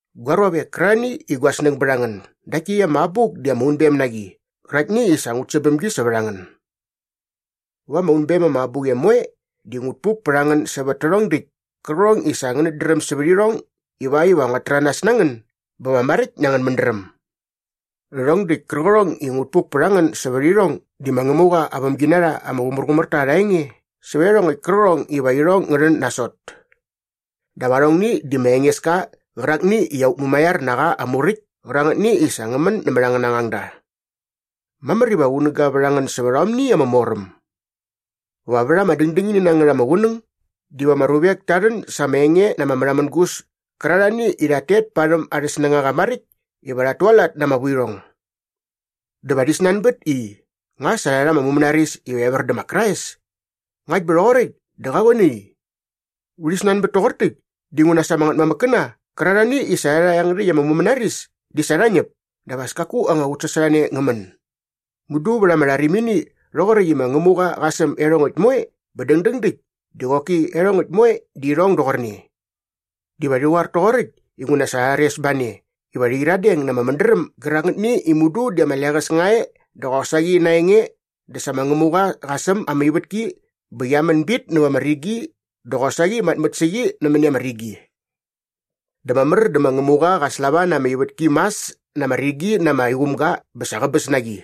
Gua ruavek kärarhani i gua snäng bät a ngän, dakt täkt ama abuk di ama unbem na qi qäraktni i sa ngut säm bäm gi sävät a ngän. Va ama unbem ama abuqem moe di ngut puk pät a ngän sävät tärhong däkt kärqärhong i sa ngänät dräm sävät irhong ivakt iva nguat täranas na ngän bä va maräkt na angän mädräm. Rhärhong däkt kärqärhong i ngut puk pät a ngän sävät irhong di ma Ngämuqa aa vämginarha ama qumärqumär ta arha enge sävät iarhongäkt kärqärhong iva irhong ngä rhän nasot. Dap arhongni di ma Engeska qärakni i aut mumaiar na qa aa muräkt kärangätni i sa ngä män nämät angäna ngangda. Mamär iva qunäga vät a ngän sävät aomni ama moräm. Va vät ama dängdängini na ngät ama qunäng diva ama ruvek ta rhän sa arha enge na ama märhamängus kärarhani i rhat tet parhäm arhä snängaqa maräkt iva rhat tualat na ama vuirhong. Dä va rhi snanbät i, “Nga sa rha mumänaris iva evär dä ma Krais? Ngakt bä rhoqoräkt dä qa qoe nai? Urhi snanbät toqor täkt dinguna sa ama ngätmamäkkäna qärarhani i sa rha rha iangärhäkt ama mumänaris di sa rha ñäp dap as kaku anga qutsasorhane ngä män. Mudu vät ama rharimini rhoqoräkt i ma Ngämuqa qa säm iarhongäkt moe bä dängdäng däkt di qoki iarhongäkt moe di irhong doqorne.” Diva rhi qoar toqoräkt inguna sa rha rhares ba ne iva rhi qyiradeng na ama mädräm gärangätni i mudu di ama leqäs nga e dä qosaqi na aa enge di sa ma Ngämuqa qa säm ama ivätki bä qia män bit näva ama rigi dä qosaqi matmät sä qi nämäni ama rigi. Dä mamär dä ma Ngämuqa qa slava na ama ivätki mas na ama rigi na ama iqumga bä sa qäbäs na qi.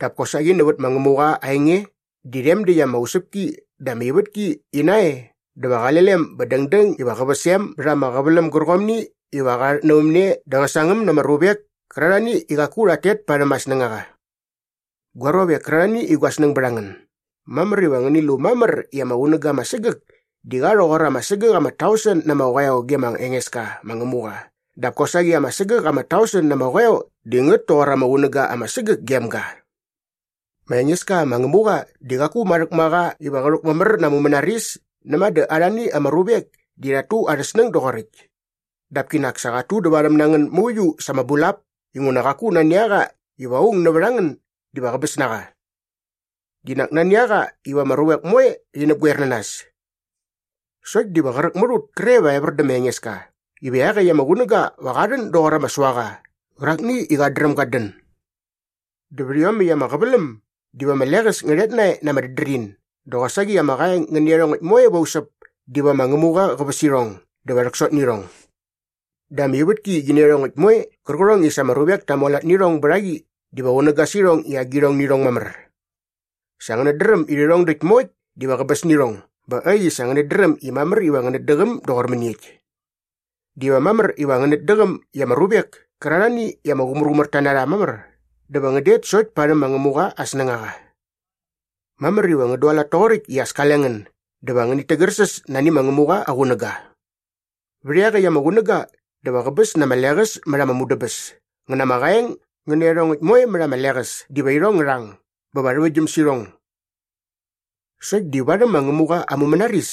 Dap kosaqi nävät ma Ngämuqa aa enge di rhem däkt ama usäpki dä ama ivätki ina e dä va qale lem bä dängdäng iva qä väs em bät ama qäväläm gärqomni iva qa rhatnävämne dä qä sangäm na ama ruvek kärarhani i qaku rhat tet parhäm aa snängaqa. Gua ruavek kärarhani i gua snäng bät a ngän, mamär iva ngäni lu mamär i ama qunäga ama sägäk di qa rhoqor ama sägäk ama tausen na ama qoeo ge ma Engeska ma Ngämuqa dap kosaqi ama sägäk ama tausen na ama qoeo di ngät toqor ama qunäga ama sägäk gem ga. Ma Engeska ma Ngämuqa di qaku marhäk ma qa iva qä rhäkmamär na aa mumänaris näma dä arhani ama ruvek di rhat tu arhä snäng doqoräkt. Dap kinak sa qat tudävarhäm na ngän mauiu sa ama bulap inguna qaku nani a qa iva aung nävät a ngän diva qäbäs na qa. Di nak nani a qa iva ama ruvek moe rhi näpgoer na nas. Sokt diva qräk mät ut kre va evär dä ma Engeska iva iaqäkt ama qunäga va qa rhän doqor ama suaqa qärakni i qat dräm gat dän. Dä vät iomäkt ama qäväläm diva ama leqäs ngä rhet nae na ama dädrin dä qosaqi ama qaeng ngä nä iarhongäkt moe va usäp diva ma Ngämuqa qä väs irhong dä va rhäksot nä irhong. Dä ama ivätki qi nä iarhongäkt moe qärqärhong i sa ama ruvek ta mualat nä irhong bät a qi diva qunäga sä irhong i agirhong nä irhong mamär. Sa ngänät dräm i rhärhong däkt moekt diva qäbäs nä irhong bä äkt i sa ngänät dräm i mamär iva ngänät däqäm doqor mäniekt. Diva mamär iva ngänät däqäm i ama ruvek kärarhani i ama qumärqumärta na rha mamär dä va ngän det sokt parhäm ma Ngämuqa aa snängaqa. Mamär iva ngän dualat toqoräkt i as kale ngän dä va ngänit tägärsäs nani ma Ngämuqa aa qunäga. Vät iaqäkt ama qunäga dä va qäbäs na ama leqäs mät ama mudäbäs ngä na ama qaeng ngä nä iarhongäkt moe mät ama leqäs diva irhong ngä rhang bä va rhäväktgyäm sä irhong! Sokt di varhäm ma Ngämuqa aa mumänaris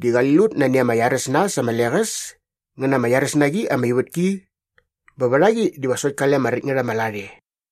di qali lut nani ama iaräs na äs ama leqäs ngä na ama iaräs na qi ama ivätki bä vät a qi diva sokt kale ama räkt ngät ama lat e.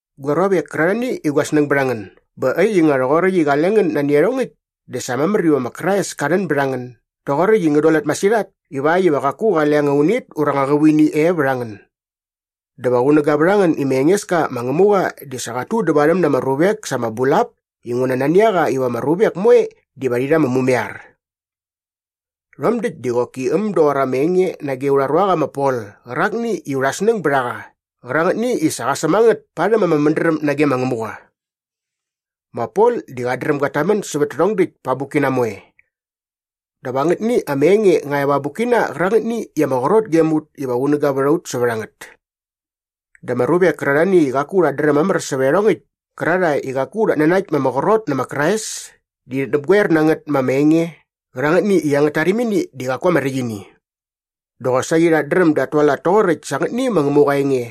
Gua ruavek kärarhani i gua snäng bät a ngän, bä äkt i nga rhoqoräkt i qale ngän nani iarhongäkt dä sa mamär iva ma Krais ka rhän bät a ngän doqoräkt i ngän dualat masirhat ivakt iva qaku qale anga unit ura anga qävuini e vät a ngän. Dä va qunäga vät a ngän i ma Engeska ma Ngämuqa di sa qat tudävarhäm na ama ruvek sa ama bulap inguna nani a qa iva ama ruvek moe diva rhi rha ama mumaiar. Rhom däkt di qoki äm doqor ama enge nage aurha ruaqa ma Pol qärakni i urha snäng bät a qa qärangätni i sa qa säm a ngät parhäm ama mädräm nage ma Ngämuqa. Ma Pol di qat dräm gat tamän sävät tärhong däkt pa aa abukkina moe. Dap angätni ama enge nga e va aa abukkina qärangätni i ama qrot gem ut iva qunäga vät a ut sävät a ngät. Dä ama ruvek kärarhani i qaku rhat dräm mamär sävät iarhongäkt kärarhae i qaku rhat nanakt ma ama qrot nä ma Krais di rhit näpgoer na ngät ma ama enge qärangätni i angät tarimini di qaku ama räkt ini. Dä qosaqi rhat dräm dat tualat toqoräkt sa angätni ma Ngämuqa aa enge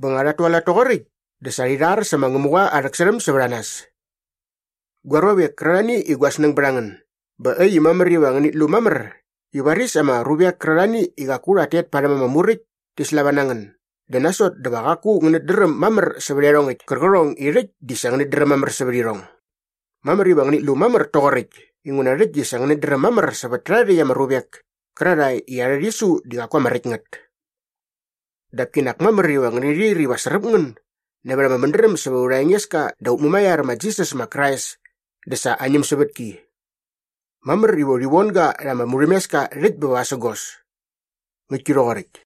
bä nga rhat tualat toqoräkt dä sa rhi rhar sä ma Ngämuqa aa rhäksärhäm sävät a nas. Gua ruavek kärarhani i gua snäng bät a ngän, bä äkt i mamär iva ngänit lu mamär i varis ama ruvek kärarhani i qaku rhat tet parhäm ama muräkt ti slava na ngän dä nasot dä va qaku ngänät dräm mamär sävät iarhongäkt kärqärhong i rhäkt di sa ngänät dräm mamär sävät irhong. Mamär iva ngänit lu mamär toqoräkt inguna rhäkt di sa ngänät dräm mamär sävät tärha rhäkt ama ruvek kärarhae i arhä rhisu di qaku ama räkt ngät. Dap kinak mamär iva ngäni rhir iva sräp ngän nävät ama mädräm sävät aurha Engeska dä aut Mumaiar ma Jisas ma Krais dä sa aa ñämsävätki. Mamär iva urhi von ga rha ama murhämeska rhäkt bä vasägos. Ngäktki rhoqoräkt.